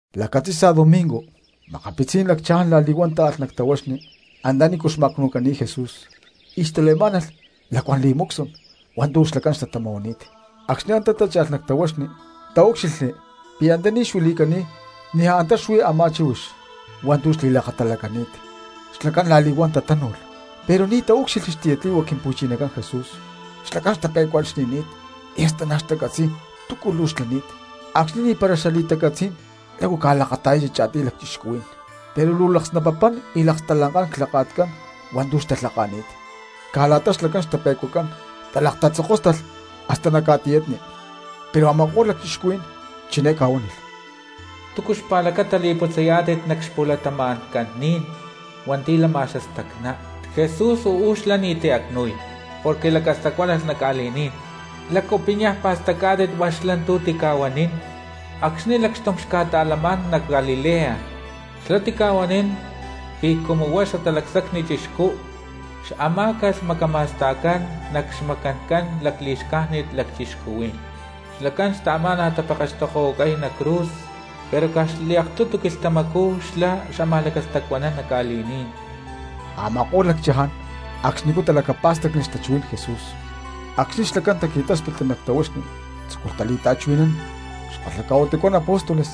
Lacatzi̠sa domingo, makapitzí̠n lacchaján la̠li̠huán táalh nac tahuaxni antanícu xma̠cnu̠cani̠t Jesús y xtale̠má̠nalh xalacuán perfumes hua̠ntu̠ xlacán xtatama̠huani̠t. Acxni̠ antá tácha̠lh nac tahuaxni taúcxilhli pi̠ antaní xuili̠cani̠t niaj antá xuí a̠má chíhuix hua̠ntu̠ xli̠lakatalacani̠t. Xlacán la̠li̠huán tatánu̠lh pero ni̠tu̠ taúcxilhli xtiyatli̠hua Quimpu̠chinacán Jesús. Xlacán xtape̠cuaxni̠ni̠t, y hasta ni̠ xtacatzi̠y túcu luu xlani̠t, acxni̠ ni̠para xali̠tacatzí̠n lácu ca̠lakata̠yachi cha̠tiy lacchixcuhuí̠n, pero luu laksnapapán y lakstalankán clhaka̠tcán hua̠ntu̠ xtalhaka̠ni̠t. Caj la̠ta xlacán xtape̠cuacán talakatatzokóstalh hasta nac ca̠tiyatni, pero a̠ma̠ko̠lh lacchixcuhuí̠n chiné ca̠huánilh: —¿Túcu xpa̠lacata li̠putzayá̠tit nac xpu̠latama̠ncán ni̠n hua̠nti̠ lama xastacná? Jesús uú xlá ni̠ti̠ acnu̠y porque lacastacuánalh nac ca̠li̠ní̠n. ¿Lácu pi̠ niaj pa̠stacá̠tit hua̠ntu̠ xlá tica̠huanín acxni̠ lacxtum xca̠ta̠lamá̠n nac Galilea? Xlá tica̠huanín pi̠ cumu huá xlá Xatalacsacni Chixcú xamá̠calh macama̠sta̠cán nac xmacancán lacli̠xcájnit lacchixcuhuí̠n. Xlacán xtaamá̠nalh tapekextokohuacay nac cruz, pero caj xliaktutu quilhtamacú xlá xámaj lacastacuanán nac ca̠li̠ní̠n. Ama̠ko̠lh lacchaján acxnicú talacapá̠stacli xtachuhuí̠n Jesús. Acxni̠ xlacán taqui̠táspitli nac tahuaxni tzúculh tali̠ta̠chuhui̠nán xkalhaca̠huitucán apóstoles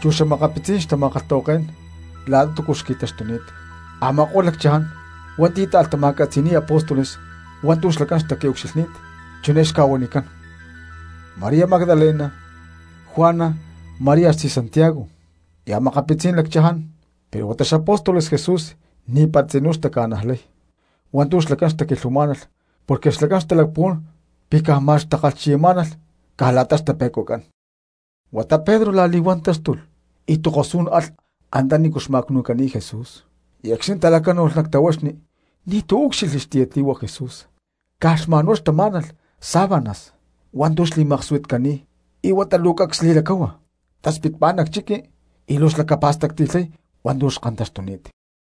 chu xa̠makapitzí̠n xtama̠kalhtahuaké̠n la̠ta túcu xtaqui̠ucxilhni̠t. Ama̠ko̠lh lacchaján hua̠nti̠ táalh tama̠catzi̠ni̠y apóstoles hua̠ntu̠ xlacán xtaqui̠ucxilhni̠t chiné xca̠huanicán: María Magdalena, Juana, María xtzí Santiago, y a̠makapitzí̠n lacchaján. Pero huata xapóstoles Jesús ni̠para tzinú taca̠nájlalh hua̠ntu̠ xlacán xtaquilhuamá̠nalh porque xtalacpuhuán pi̠ ma̠x caj xtakalhchiya̠tnamá̠nalh caj la̠ta xtape̠cuacán. Huata Pedro la̠li̠huán táxtulh y tokosú̠n alh antanícu xma̠cnu̠cani̠t Jesús; y acxni̠ talacánu̠lh nac tahuaxni ni̠tu̠ úcxilhli xmacni Jesús, caj xma̠nhuá xtamá̠nalh sábanas hua̠ntu̠ xli̠maksuitcani̠t. Y huata luu cacs li̠lacáhua taspitpá nac chiqui luu xlacapa̠stacti̠lhay hua̠ntu̠ xkantaxtuni̠t.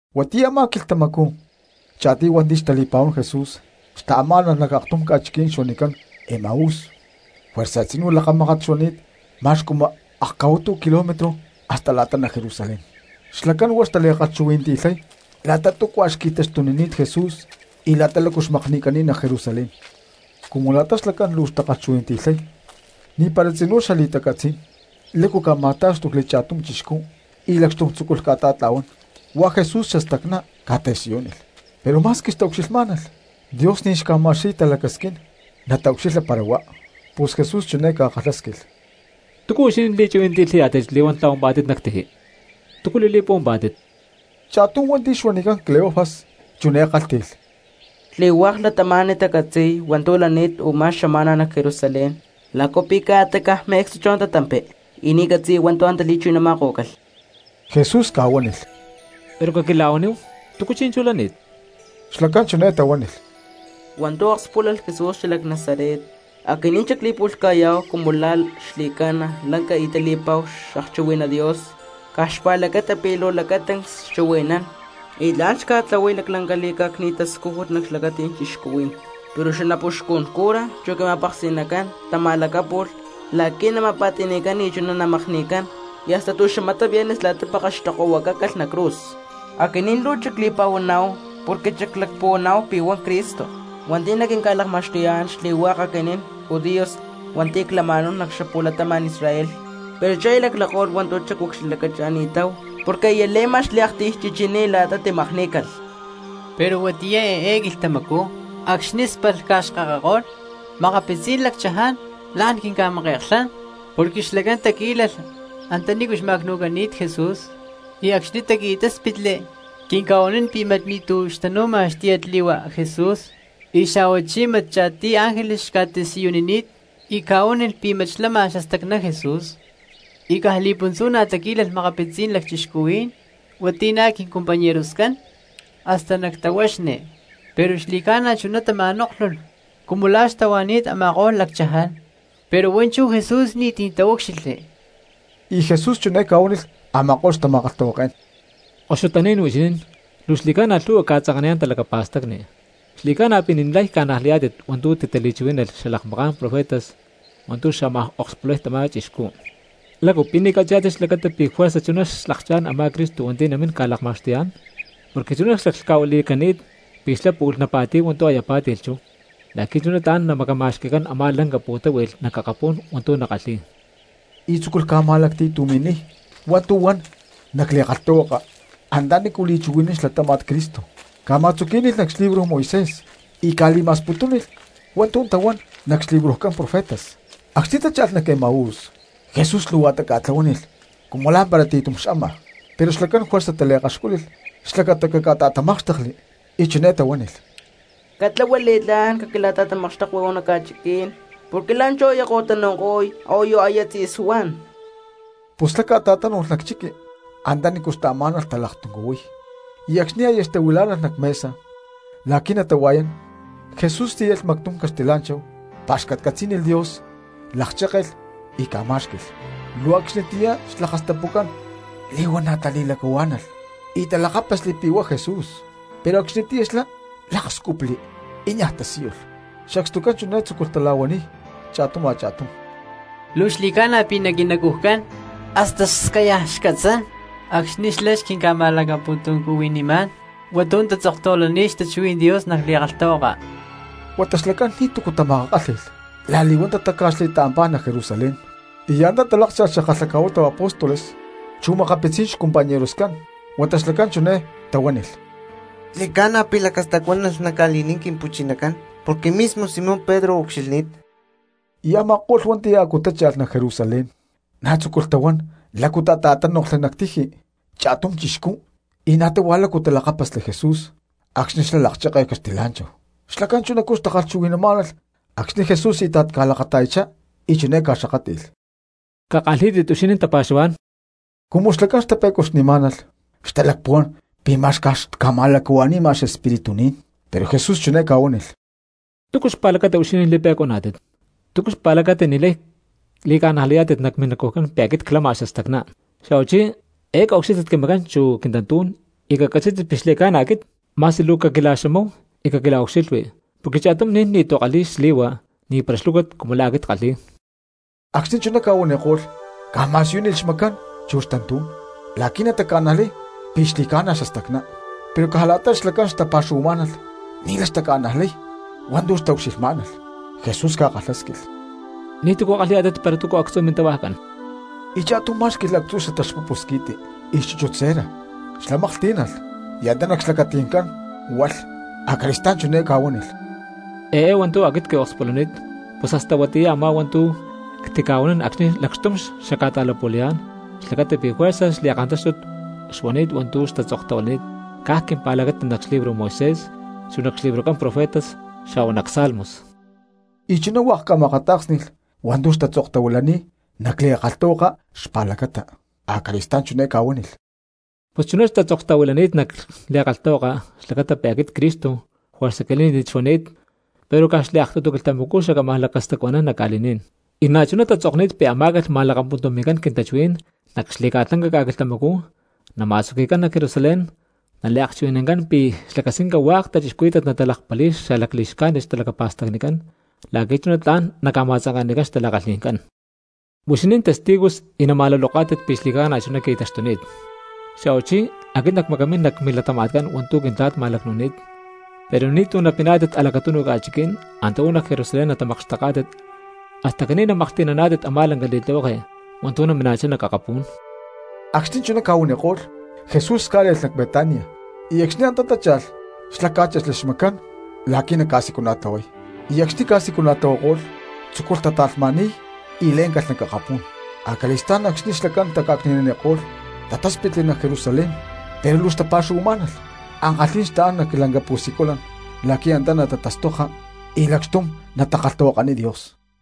Huatiyá a̠má quilhtamacú cha̠tiy hua̠nti̠ xtali̠pa̠huán Jesús xtaamá̠nalh nac aktum ca̠chiquí̠n huanicán Emaús, juerza tzinú lakamákat xuani̠t ma̠x cumu akca̠huitu kilómetro hasta la̠ta nac Jerusalén. Xlacán huá xtali̠kalhchuhui̠nanti̠lhay la̠ta túcua xqui̠taxtunini̠t Jesús y la̠ta xmakni̠cani̠t nac Jerusalén. Cumu la̠ta xlacán luu xtakalhchuhui̠nanti̠lhay ni̠para tzinú xali̠tacatzí̠n lácu ca̠ma̠tá̠xtucli cha̠tum chixcú y lacxtum tzúculh ca̠ta̠tla̠huán, huá Jesús xastacná ca̠tasiyúnilh. Pero ma̠squi xtaucxilhmá̠nalh, Dios ni̠ xca̠ma̠xqui̠y talacasquín nataucxilha para huá. Pus Jesús chiné ca̠kalhásquilh: —¿Túcu huixinín li̠chuhui̠nanti̠lhayá̠tit li̠huán tla̠huampá̠tit nac tiji? ¿Túcu li̠li̠puhuampá̠tit? Cha̠tum hua̠nti̠ xuanicán Cleofas chiné kálhti̠lh: —Xli̠hua̠k cristianos tacatzi̠y hua̠ntu̠ lani̠t u̠má xama̠na nac Jerusalén. ¿Lácu pi̠ ca̠ta caj me̠cstu chú antá tampi y ni̠ catzi̠ya hua̠ntu̠ antá li̠chuhui̠nama̠kó̠calh? Jesús ca̠huánilh: —Pero caquila̠huaníhu, ¿túcu chi̠nchú lani̠t? Xlacán chiné tahuánilh: —Hua̠ntu̠ akspúlalh Jesús xalac Nazaret. Aquinín xacli̠pu̠lhca̠yá̠hu cumu la̠ xli̠ca̠na lanca y tali̠pa̠hu xakchuhui̠ná Dios caj xpa̠lacata pi̠ luu lacatancs xchuhui̠nán y na̠ xkalhi̠y li̠tlihueke y tla̠n xca̠tlahuay laclanca li̠cá̠cni̠t tascújut nac xlacati̠ncán cristianos. Pero xanapuxcun cura chu quima̠peksi̠nacán tama̠lacápu̠lh la̠qui̠ nama̠pa̠ti̠ni̠cán y chuná namakni̠cán, y hasta tu̠xamatá viernes la̠ta pekextokohuacácalh nac cruz. Aquinín luu xacli̠pa̠huaná̠hu porque xaclacpuhuaná̠hu pi̠ huá Cristo hua̠nti̠ naquinca̠lakma̠xtuyá̠n xli̠hua̠k aquinín judíos hua̠nti̠ clama̠náhu nac xapu̠latama̠n Israel; pero chú aya laclako̠lh hua̠ntu̠ xacucxilhlacacha̠ni̠táhu porque aya le̠ma xliaktiy chichiní la̠ta timakní̠calh. Pero huatiyá eé quilhtamacú acxni̠ spalh ca̠xkakako̠lh makapitzí̠n lacchaján la̠n quinca̠make̠klhán porque xlacán taquí̠lalh antanícu xma̠cnu̠cani̠t Jesús, y acxni̠ taqui̠táspitli quinca̠huanín pi̠ mat ni̠tu̠ xtanu̠ma xtiyatli̠hua Jesús, y xa̠huachí mat cha̠tiy ángeles xca̠tasiyunini̠t y chiné ca̠huánilh pi̠ mat xlama xastacná Jesús. Y caj li̠puntzú na̠ taquí̠lalh makapitzí̠n lacchixcuhuí̠n hua̠nti̠ na̠ quincompañeroscán hasta nac tahuaxni, pero xli̠ca̠na chuná tama̠nóklhulh cumu la̠ xtahuani̠t a̠ma̠ko̠lh lacchaján, pero huá chú Jesús ni̠ti̠ taúcxilhli. Y Jesús chiné ca̠huánilh a̠ma̠ko̠lh xtama̠kalhtahuaké̠n: —¡Koxutaní̠n huixinín cristianos, luu xli̠ca̠na lhu̠hua ca̠tzanka̠niyá̠n talacapa̠stacni, xli̠ca̠na pi̠ ni̠lay ca̠najlayá̠tit hua̠ntu̠ titali̠chuhuí̠nalh xalakmaká̠n profetas hua̠ntu̠ xámaj okspulay tamá chixcú! ¿Lácu pi̠ ni̠ catzi̠yá̠tit xlacata pi̠ juerza chuná xlakchá̠n a̠má Cristo hua̠nti̠ namíná̠n ca̠lakma̠xtuyá̠n? Porque chuná xlaclhca̠huili̠cani̠t pi̠ xlá pu̠lh napa̠ti̠y hua̠ntu̠ aya pá̠ti̠lh chú, la̠qui̠ chuná tla̠n namacama̠xqui̠cán a̠má lanca pu̠táhui̠lh nac akapú̠n hua̠ntu̠ nakalhi̠y. Y tzúculh ca̠ma̠lacti̠tumi̠niy hua̠ntu̠ huan nac li̠kalhtahuaka antanícu li̠chuhui̠nán xlatáma̠t Cristo, ca̠ma̠tzuquí̠nilh nac xlibro Moisés y ca̠li̠ma̠sputúnilh hua̠ntu̠ tahuán nac xlibrojcán profetas. Acxni̠ tácha̠lh nac Emaús, Jesús luutá ca̠tlahuánilh cumu lá̠mpara ti̠tum xama. Pero xlacán juerza taliakaxcúlilh xlacata caca̠ta̠tamákxtekli y chiné tahuánilh: —Catlahua li̠tlá̠n, caquila̠ta̠tamakxtekui uú nac ca̠chiquí̠n, porque la̠nchú aya ko̠tanu̠ko̠y a̠huayu aya tzi̠suán. Pus xlá ca̠ta̠tánu̠lh nac chiqui antanícu xtaamá̠nalh talaktuncuhuiy. Y acxni̠ aya xtahuilá̠nalh nac mesa la̠qui̠ natahua̠yá̠n, Jesús tíyalh mactum caxtilá̠nchahu, pa̠xcatcatzí̠nilh Dios, lakchékelh y ca̠má̠xqui̠lh. Luu acxnitiyá xlakastapucán li̠huana̠ tili̠lacahuá̠nalh y talakápasli pi̠ huá Jesús; pero acxnitiyá xlá lákscupli y niaj tasíyulh. Sacstucán chiné tzúculh tala̠huaniy cha̠tum a̠cha̠tum: —Luu xli̠ca̠na pi̠ nac quinacujcán hasta scayaj xcatzán acxni̠ xlá xquinca̠ma̠lacapu̠tuncuhuinimá̠n hua̠ntu̠ tatzoktahuilani̠t xtachuhuí̠n Dios nac li̠kalhtahuaka. Huata xlacán ni̠tu̠cu tamakakálhi̠lh la̠li̠huán tatáca̠xli y taampá nac Jerusalén y antá talákcha̠lh xakalhaca̠huitu apóstoles chu makapitzí̠n xcompañeroscán. Huata xlacán chiné tahuánilh: —Xli̠ca̠na pi̠ lacastacuanani̠t nac ca̠li̠ní̠n Quimpu̠chinacán porque mismo Simón Pedro ucxilhni̠t. Y a̠ma̠ko̠lh hua̠nti̠ a̠cú tácha̠lh nac Jerusalén na̠ tzúculh tahuán lácu tata̠tánoklhli nac tiji cha̠tum chixcú, y na̠ táhua lácu talakápasli Jesús acxni̠ xlá lakchékelh caxtilá̠nchahu. Xlacán chunacú xtachuhui̠namá̠nalh acxni̠ Jesús íta̠t ca̠lakata̠yachá y chiné ca̠xakátli̠lh: —Cakalhí̠tit huixinín tapa̠xuhuá̠n. Cumu xlacán xtape̠cuaxni̠má̠nalh xtalacpuhuán pi̠ ma̠x caj xca̠ma̠lacahua̠ni̠ma xespíritu ni̠n. Pero Jesús chiné ca̠huánilh: —¿Túcu xpa̠lacata huixinín li̠pe̠cuaná̠tit? ¿Túcu xpa̠lacata ni̠lay li̠ca̠najlayá̠tit nac minacujcán pi̠ aquit clama xastacná? Xa̠huachí, eé caucxílhtit quimacán chu quintantú̠n y cacatzí̠tit pi̠ xli̠ca̠na aquit. Ma̠squi luu caquila̠xamáhu y caquila̠ucxilhui porque cha̠tum ni̠n ni̠tu̠ kalhi̠y xli̠hua ni̠para xlúcut cumu la̠ aquit ckalhi̠y. Acxni̠ chuná ca̠huaniko̠lh ca̠ma̠siyúnilh xmacán chu xtantú̠n la̠qui̠ nataca̠najlay pi̠ xli̠ca̠na xastacná. Pero caj la̠ta xlacán xtapa̠xuhuamá̠nalh ni̠lay xtaca̠najlay hua̠ntu̠ xtaucxilhmá̠nalh. Jesús ca̠kalhásquilh: —¿Ni̠túcu kalhi̠yá̠tit para túcu actzu̠ mintahuajcán? Y cha̠tum má̠xqui̠lh actzu̠ xataxpupu squi̠ti chu xchúchut cera. Xlá maklhtí̠nalh y antá nac xlacati̠ncán hualh. Acali̠stá̠n chiné ca̠huánilh: —Eé hua̠ntu̠ aquit quiakspulani̠t pus hasta huatiyá a̠má hua̠ntu̠ ctica̠huanín acxni̠ lacxtum xacca̠ta̠lapu̠layá̠n, xlacata pi̠ juerza xli̠kantáxtut xuani̠t hua̠ntu̠ tatzoktahuilani̠t caj quimpa̠lacata nac xlibro Moisés, chu nac xlibrojcán profetas xa̠hua nac salmos. Y chuná hua̠k ca̠ma̠akatá̠ksni̠lh hua̠ntu̠ xtatzoktahuilani̠t nac li̠kalhtahuaka xpa̠lacata. Acali̠stá̠n chiné ca̠huánilh: —Pus chuná tatzoktahuilani̠t nac li̠kalhtahuaka xlacata pi̠ aquit Cristo juerza quilí̠ni̠t xuani̠t, pero caj xliaktutu quilhtamacú xacámaj lacastacuanán nac ca̠li̠ní̠n, y na̠chuná tatzokni̠t pi̠ amá̠calh ma̠lakapuntumi̠cán quintachuhuí̠n nac xli̠ca̠lanca ca̠quilhtamacú, nama̠tzuqui̠cán nac Jerusalén; naliakchuhui̠nancán pi̠ xlacasquinca hua̠k xcristianos natalakpali̠y xali̠xcájnit xtalacapa̠stacnicán la̠qui̠ chuná tla̠n naca̠ma̠tzanke̠nanicán xtala̠kalhi̠ncán. Huixinín testigos y nama̠luloká̠tit pi̠ xli̠ca̠na chuná qui̠taxtuni̠t. Xa̠huachí aquit nacmacamín nac milatama̠tcán hua̠ntu̠ Quintla̠t ma̠lacnu̠ni̠t; pero ni̠tu̠ napiná̠tit a̠lacatunu ca̠chiquí̠n, antá uú nac Jerusalén natamakxteká̠tit hasta caní namaklhti̠naná̠tit a̠má lanca li̠tlihueke hua̠ntu̠ namina̠chá nac akapú̠n. Acxni̠ chuná ca̠huaniko̠lh, Jesús cá̠le̠lh nac Betania, y acxni̠ antá tácha̠lh xlá cá̠chexli xmacán la̠qui̠ naca̠siculana̠tlahuay. Y acxni̠ ca̠siculana̠tlahuako̠lh tzúculh tata̠lhma̠ni̠y y lé̠ncalh nac akapú̠n. Acali̠stá̠n acxni̠ xlacán taca̠cni̠naniko̠lh tatáspitli nac Jerusalén pero luu xtapa̠xuhuamá̠nalh. Ankalhí̠n xtaán nac lanca pu̠siculan la̠qui̠ antá natatastoka y lacxtum natakalhtahuakaniy Dios.